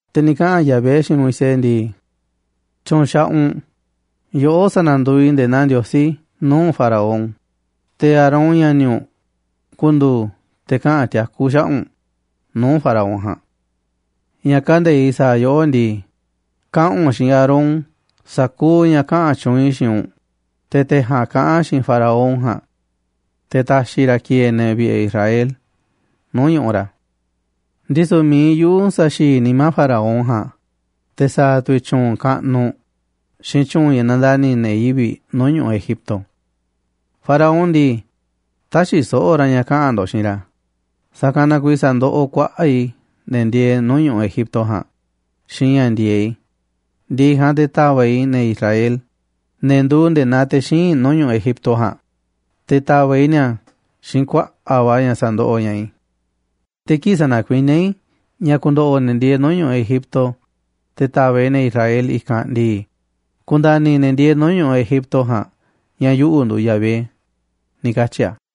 Te̱ ni̱ kaꞌa̱n Yahvé xiinꞌ Moisés ndii: ―Tyu̱u̱n xaꞌaꞌ u̱nꞌ, yoꞌó sa̱na̱nduuꞌ i̱ nde̱e̱ naa Ndiosí nuu̱ꞌ Faraón, te̱ Aarón, ña̱ni̱ u̱nꞌ, ku̱ndu̱u̱ te̱ kaꞌa̱n tiakú xaꞌa̱ꞌ u̱nꞌ nuu̱ꞌ Faraón ja̱a̱nꞌ. Ña̱ kande̱iꞌ sa̱a̱ yoꞌó ndii, kaꞌa̱n u̱nꞌ xiinꞌ Aarón sa̱kuuꞌ ña̱ ni̱ kaꞌa̱n tyuunꞌ i̱ xiinꞌ u̱nꞌ, te̱ te̱ ja̱a̱nꞌ kaꞌa̱n xiinꞌ Faraón ja̱a̱nꞌ te̱ ta̱xi̱ ra̱ ki̱e̱e̱ ne̱ vi̱ꞌe̱ Israel nuu̱ꞌ ñu̱ꞌuꞌ ra̱. Ndisu̱ mi̱iꞌ yuꞌu̱ sa̱xi̱i̱ nimá Faraón ja̱a̱nꞌ, te̱ sa̱a̱ tu̱ i̱ tyuunꞌ kaꞌnuꞌ xiinꞌ tyu̱u̱n ña̱ nandani̱ ne̱ yivi̱ꞌ nuu̱ꞌ ñu̱ꞌuꞌ Egipto. Faraón ndii, tä̱xi̱ so̱ꞌo̱ ra̱ ña̱ kaꞌa̱n ndo̱ꞌ xiinꞌ ra̱, sa̱kanꞌ na kuiiꞌ sa̱ndoꞌoꞌ kuaꞌa̱ꞌ i̱ ne̱ ndieeꞌ nuu̱ꞌ ñu̱ꞌuꞌ Egipto ja̱a̱nꞌ xiinꞌ ña̱ ndi̱e̱eꞌ i̱, ndi̱ꞌi̱ ja̱a̱nꞌ te̱ ta̱va̱ꞌ i̱ ne̱ Israel, ne̱ nduuꞌ nde̱e̱ naa te̱ xíinꞌ i̱, nuu̱ꞌ ñu̱ꞌuꞌ Egipto ja̱a̱nꞌ, te̱ ta̱va̱ꞌ i̱ ni̱a̱ xiinꞌ kuaꞌa̱ꞌ va̱ ña̱ sa̱ndoꞌoꞌ ña̱ꞌaꞌ i̱. Te̱ kii̱ꞌ sa̱na̱kuiníá i̱ ña̱ ku̱ndo̱ꞌo̱ ne̱ ndieeꞌ nuu̱ꞌ ñu̱ꞌuꞌ Egipto, te̱ ta̱va̱ꞌ i̱ ne̱ Israel i̱kanꞌ ndii, ku̱nda̱ni̱ ne̱ ndieeꞌ nuu̱ꞌ ñu̱ꞌuꞌ Egipto ja̱a̱n ña̱ yuꞌu̱ nduuꞌ Yahvé ―ni̱ katyi̱ a̱.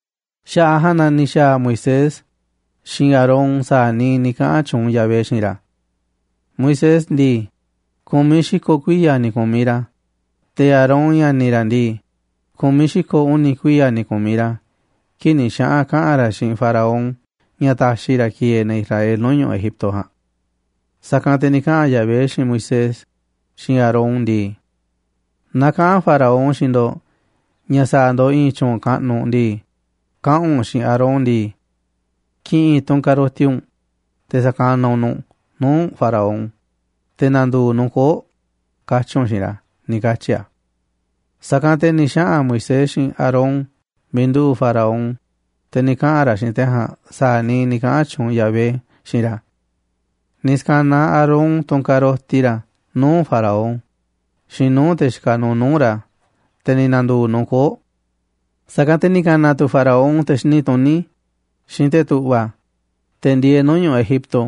Xaꞌa̱ꞌ a̱ ja̱a̱nꞌ na ni̱ xa̱a̱ Moisés xiinꞌ Aarón sa̱a̱ niiꞌ ni̱ kaꞌa̱n tyuunꞌ Yahvé xiinꞌ ra̱. Moisés ndii, ku̱miꞌ xi̱ko̱ kuiya̱ ni̱ ku̱miꞌ ra̱, te̱ Aarón, ña̱ni̱ ra̱ ndii, ku̱miꞌ xi̱ko̱ uni̱ kuiya̱ ni̱ ku̱miꞌ ra̱ kii̱ꞌ ni̱ xaꞌa̱n kaꞌa̱n ra̱ xiinꞌ Faraón ña̱ ta̱xi̱ ra̱ ki̱e̱e̱ ne̱ Israel nuu̱ꞌ ñu̱ꞌuꞌ Egipto ja̱a̱nꞌ. Sa̱kanꞌ te̱ ni̱ kaꞌa̱n Yahvé xiinꞌ Moisés xiinꞌ Aarón ndii: ―Naaꞌ kaꞌa̱n Faraón xiinꞌ ndo̱ꞌ ña̱ sa̱a̱ ndo̱ꞌ i̱i̱n tyu̱u̱n kaꞌnuꞌ ndii, kaꞌa̱n u̱nꞌ xiinꞌ Aarón ndii: “Ki̱ꞌi̱n tunꞌ ka̱roti u̱nꞌ te̱ sa̱kanaꞌ u̱nꞌ nu̱ꞌ nuu̱ꞌ Faraón, te̱ na̱ndu̱u̱ nu̱ꞌ koo̱ꞌ”, katyi̱ u̱nꞌ xiinꞌ ra̱ ―ni̱ katyi̱ a̱. Sa̱kanꞌ te̱ ni̱ xaꞌa̱n Moisés xiinꞌ Aarón miiꞌ nduꞌu̱ꞌ Faraón, te̱ ni̱ kaꞌa̱n ra̱ xiinꞌ te̱ ja̱a̱nꞌ sa̱a̱ niiꞌ ni̱ kaꞌa̱n tyuunꞌ Yahvé xiinꞌ ra̱. Ni̱ ska̱naꞌ Aarón tunꞌ ka̱roti ra̱ nuu̱ꞌ Faraón xiinꞌ nuu̱ꞌ te̱ xikaꞌ nuuꞌ nuu̱ꞌ ra̱, te̱ ni̱ na̱ndu̱u̱ nu̱ꞌ koo̱ꞌ. Sa̱kanꞌ te̱ ni̱ ka̱na̱ tu̱ Faraón te̱ xini tuní xiinꞌ te̱ tu̱ꞌva̱, te̱ ndieeꞌ nuu̱ꞌ ñu̱ꞌuꞌ Egipto,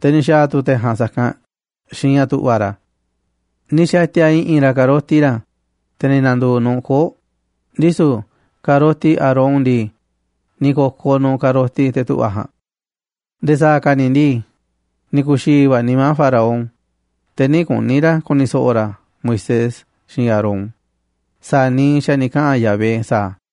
te̱ ni̱ xa̱a̱ tu̱ te̱ ja̱a̱nꞌ sa̱kanꞌ xiinꞌ ña̱ tu̱ꞌva̱ ra̱. Ni̱ xa̱ti̱a̱ i̱ꞌi̱n ra̱ ka̱roti ra̱, te̱ ni̱ na̱ndu̱u̱ nu̱ꞌ koo̱ꞌ, ndisu̱ ka̱roti Aarón ndii, ni̱ ko̱koꞌ nu̱ꞌ ka̱roti te̱ tu̱ꞌva̱ ja̱a̱nꞌ. Nde̱e̱ sa̱a̱ ka̱ ni̱ ndii, ni̱ ku̱xi̱i̱ va̱ nimá Faraón, te̱ nï̱ kuni̱ ra̱ ku̱ni̱ so̱ꞌo̱ ra̱ Moisés xiinꞌ Aarón sa̱a̱ niiꞌ xa̱ ni̱ kaꞌa̱n Yahvé sa̱aꞌ a̱.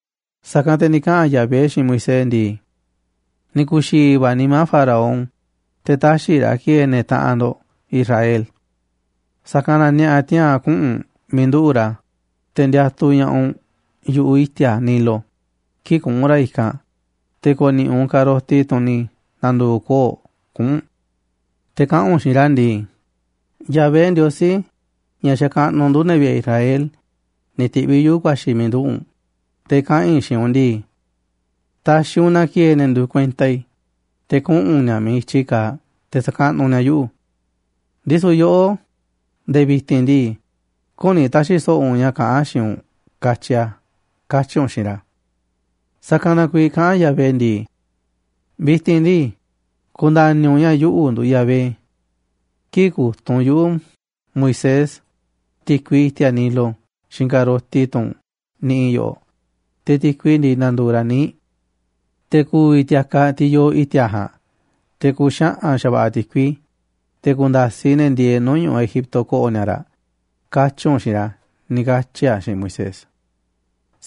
Sa̱kanꞌ te̱ ni̱ kaꞌa̱n Yahvé xiinꞌ Moisés ndii: ―Ni̱ ku̱xi̱i̱ va̱ nimá Faraón, te̱ tä̱xi̱ ra̱ ki̱e̱e̱ ne̱ taꞌanꞌ ndo̱ꞌ Israel. Sa̱kanꞌ na ni̱a̱ꞌa̱ tiaa̱n kuꞌu̱n u̱nꞌ miiꞌ nduꞌu̱ꞌ ra̱, te̱ ndiatuꞌ ña̱ꞌaꞌ u̱nꞌ yu̱ꞌuꞌ i̱ti̱a̱ Nilo kii̱ꞌ kuꞌu̱n ra̱ i̱kanꞌ, te̱ ko̱ni̱ꞌi̱ u̱nꞌ ka̱roti, tunꞌ ni̱ na̱ndu̱u̱ koo̱ꞌ, kuꞌu̱n u̱nꞌ. Te̱ kaꞌa̱n u̱nꞌ xiinꞌ ra̱ ndii: “Yahvé, Ndiosí ña̱ xakaꞌnuꞌ ndu̱, ne̱ vi̱ꞌe̱ Israel, ni̱ ti̱ꞌviꞌ yuꞌu̱ ku̱a̱xi̱ i̱ miiꞌ nduꞌu̱ꞌ u̱nꞌ te̱ kaꞌa̱n i̱ xiinꞌ u̱nꞌ ndii: ‘Ta̱xi̱ u̱nꞌ na ki̱e̱e̱ ne̱ nduuꞌ kuenta i̱, te̱ kuꞌu̱n ni̱a̱ miiꞌ i̱tyi kaaꞌ te̱ sa̱kaꞌnuꞌ ni̱a̱ yuꞌu̱. Ndisu̱ yoꞌó, nde̱e̱ vi̱ti̱n ndii, küni ta̱xi̱ so̱ꞌo̱ u̱nꞌ ña̱ kaꞌán a̱ xiinꞌ u̱nꞌ, katyi a̱’, katyi̱ u̱nꞌ xiinꞌ ra̱.” Sa̱kanꞌ na kuiiꞌ kaꞌán Yahvé ndii: “Vi̱ti̱n ndii, ku̱nda̱ni̱ u̱nꞌ ña̱ yuꞌu̱ nduuꞌ Yahvé. Kii̱ꞌ ku̱tunꞌ yuꞌu̱ Moisés ti̱kui i̱ti̱a̱ Nilo xiinꞌ ka̱roti tunꞌ niꞌiꞌ i̱ yoꞌoꞌ, te̱ ti̱kui ndii, na̱ndu̱u̱ ra̱ níiꞌ. Te̱ ku̱vi̱ ti̱a̱kaꞌ, tiꞌ yoo i̱ti̱a̱ ja̱a̱nꞌ, te̱ ku̱xaꞌa̱n xa̱va̱ꞌa̱ ti̱kui, te̱ ku̱nda̱siꞌ ne̱ ndieeꞌ nuu̱ꞌ ñu̱ꞌuꞌ Egipto ko̱ꞌo̱ ni̱a̱ raꞌ, katyi̱ u̱nꞌ xiinꞌ ra̱” ―ni̱ katyi̱ a̱ xiinꞌ Moisés.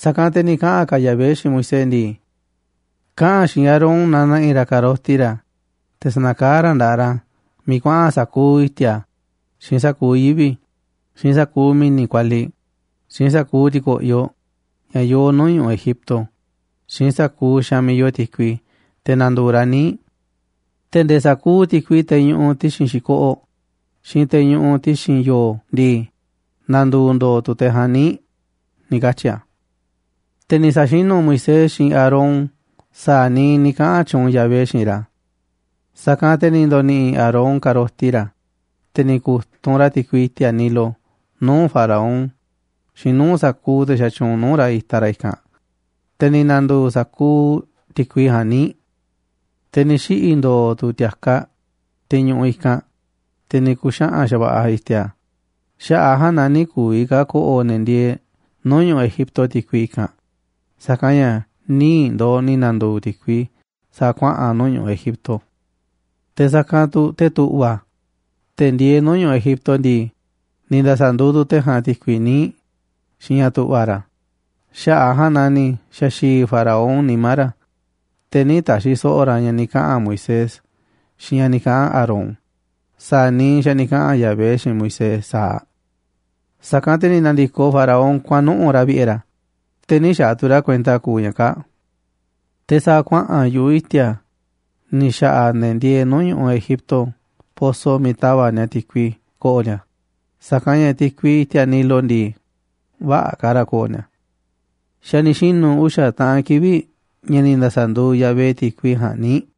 Sa̱kanꞌ te̱ ni̱ kaꞌa̱n ka̱ Yahvé xiinꞌ Moisés ndii: ―Kaꞌa̱n xiinꞌ Aarón na na̱ꞌi̱ ra̱ ka̱roti ra̱, te̱ sa̱na̱kaá ra̱ nda̱ꞌaꞌ ra̱ miiꞌ kuaꞌa̱n sa̱kuuꞌ i̱ti̱a̱, xiinꞌ sa̱kuuꞌ yivi̱, xiinꞌ sa̱kuuꞌ mi̱ni̱ kualiꞌ, xiinꞌ sa̱kuuꞌ ti̱ko̱ꞌyoꞌ ña̱ yoo nuu̱ꞌ ñu̱ꞌuꞌ Egipto, xiinꞌ sa̱kuuꞌ xaanꞌ miiꞌ yoo ti̱kui, te̱ na̱ndu̱u̱ raꞌ níiꞌ. Te̱ nde̱e̱ sa̱kuuꞌ ti̱kui, teꞌ ñuꞌuꞌ ti̱xi̱n xi̱koꞌoꞌ, xiinꞌ teꞌ ñuꞌuꞌ ti̱xi̱n yo̱o̱ ndii, na̱ndu̱u̱ ndo̱o̱ tu̱ teꞌ ja̱a̱nꞌ níiꞌ ―ni̱ katyi̱ a̱. Te̱ ni̱ sa̱xinu̱ Moisés xiinꞌ Aarón sa̱a̱ niiꞌ ni̱ kaꞌa̱n tyuunꞌ Yahvé xiinꞌ ra̱. Sa̱kanꞌ te̱ ni̱ ndo̱ni̱ꞌi̱ Aarón ka̱roti ra̱, te̱ ni̱ ku̱tunꞌ ra̱ ti̱kui i̱ti̱a̱ Nilo nuu̱ꞌ Faraón xiinꞌ nuu̱ꞌ sa̱kuuꞌ te̱ xatyuunꞌ nuu̱ꞌ ra̱ itaꞌ ra̱ i̱kanꞌ, te̱ ni̱ na̱ndu̱u̱ sa̱kuuꞌ ti̱kui ja̱a̱nꞌ níiꞌ. Te̱ ni̱ xiꞌi̱ ndo̱o̱ tu̱ ti̱a̱kaꞌ, tiꞌ ñuꞌuꞌ i̱kanꞌ, te̱ ni̱ ku̱xaꞌa̱n xa̱va̱ꞌa̱ i̱ti̱a̱. Xaꞌa̱ꞌ a̱ ja̱a̱nꞌ na nï̱ ku̱vi̱ ka̱ ko̱ꞌo̱ ne̱ ndieeꞌ nuu̱ꞌ ñu̱ꞌuꞌ Egipto ti̱kui i̱kanꞌ, sa̱kanꞌ ña̱ níiꞌ ndooꞌ ni̱ na̱ndu̱u̱ ti̱kui sa̱a̱ kuaꞌa̱n nuu̱ꞌ ñu̱ꞌuꞌ Egipto. Te̱ sa̱kanꞌ tu̱ te̱ tu̱ꞌva̱, te̱ ndieeꞌ nuu̱ꞌ ñu̱ꞌuꞌ Egipto ndii, ni̱ nda̱sa̱nduuꞌ tu̱ te̱ ja̱a̱nꞌ ti̱kui níiꞌ xiinꞌ ña̱ tu̱ꞌva̱ ra̱. Xaꞌa̱ꞌ a̱ ja̱a̱nꞌ naa ni̱ xa̱xi̱i̱ Faraón nimá ra̱, te̱ nï̱ ta̱xi̱ so̱ꞌo̱ ra̱ ña̱ ni̱ kaꞌa̱n Moisés xiinꞌ ña̱ ni̱ kaꞌa̱n Aarón sa̱a̱ niiꞌ xa̱ ni̱ kaꞌa̱n Yahvé xiinꞌ Moisés sa̱aꞌ. Sa̱kanꞌ te̱ ni̱ na̱ndi̱koꞌ Faraón kuaꞌa̱n nuꞌu̱ꞌ ra̱ vi̱ꞌe̱ ra̱, te̱ nï̱ xaaꞌ tu̱ ra̱ kuenta kuuꞌ ña̱ kaa̱ꞌ. Te̱ sa̱a̱ kuaꞌa̱n yu̱ꞌuꞌ i̱ti̱a̱ ni̱ xa̱ꞌa̱ ne̱ ndieeꞌ nuu̱ꞌ ñu̱ꞌuꞌ Egipto poso miiꞌ ta̱va̱ꞌ ni̱a̱ ti̱kui ko̱ꞌo̱ ni̱a̱, sa̱kanꞌ ña̱ ti̱kui i̱ti̱a̱ Nilo ndii, vä̱ꞌa̱ ka̱ raꞌ ko̱ꞌo̱ ni̱a̱. Xa̱ ni̱ xinu̱ uxa̱ taꞌan kivi̱ꞌ ña̱ ni̱ nda̱sa̱nduuꞌ Yahvé ti̱kui ja̱a̱nꞌ níiꞌ.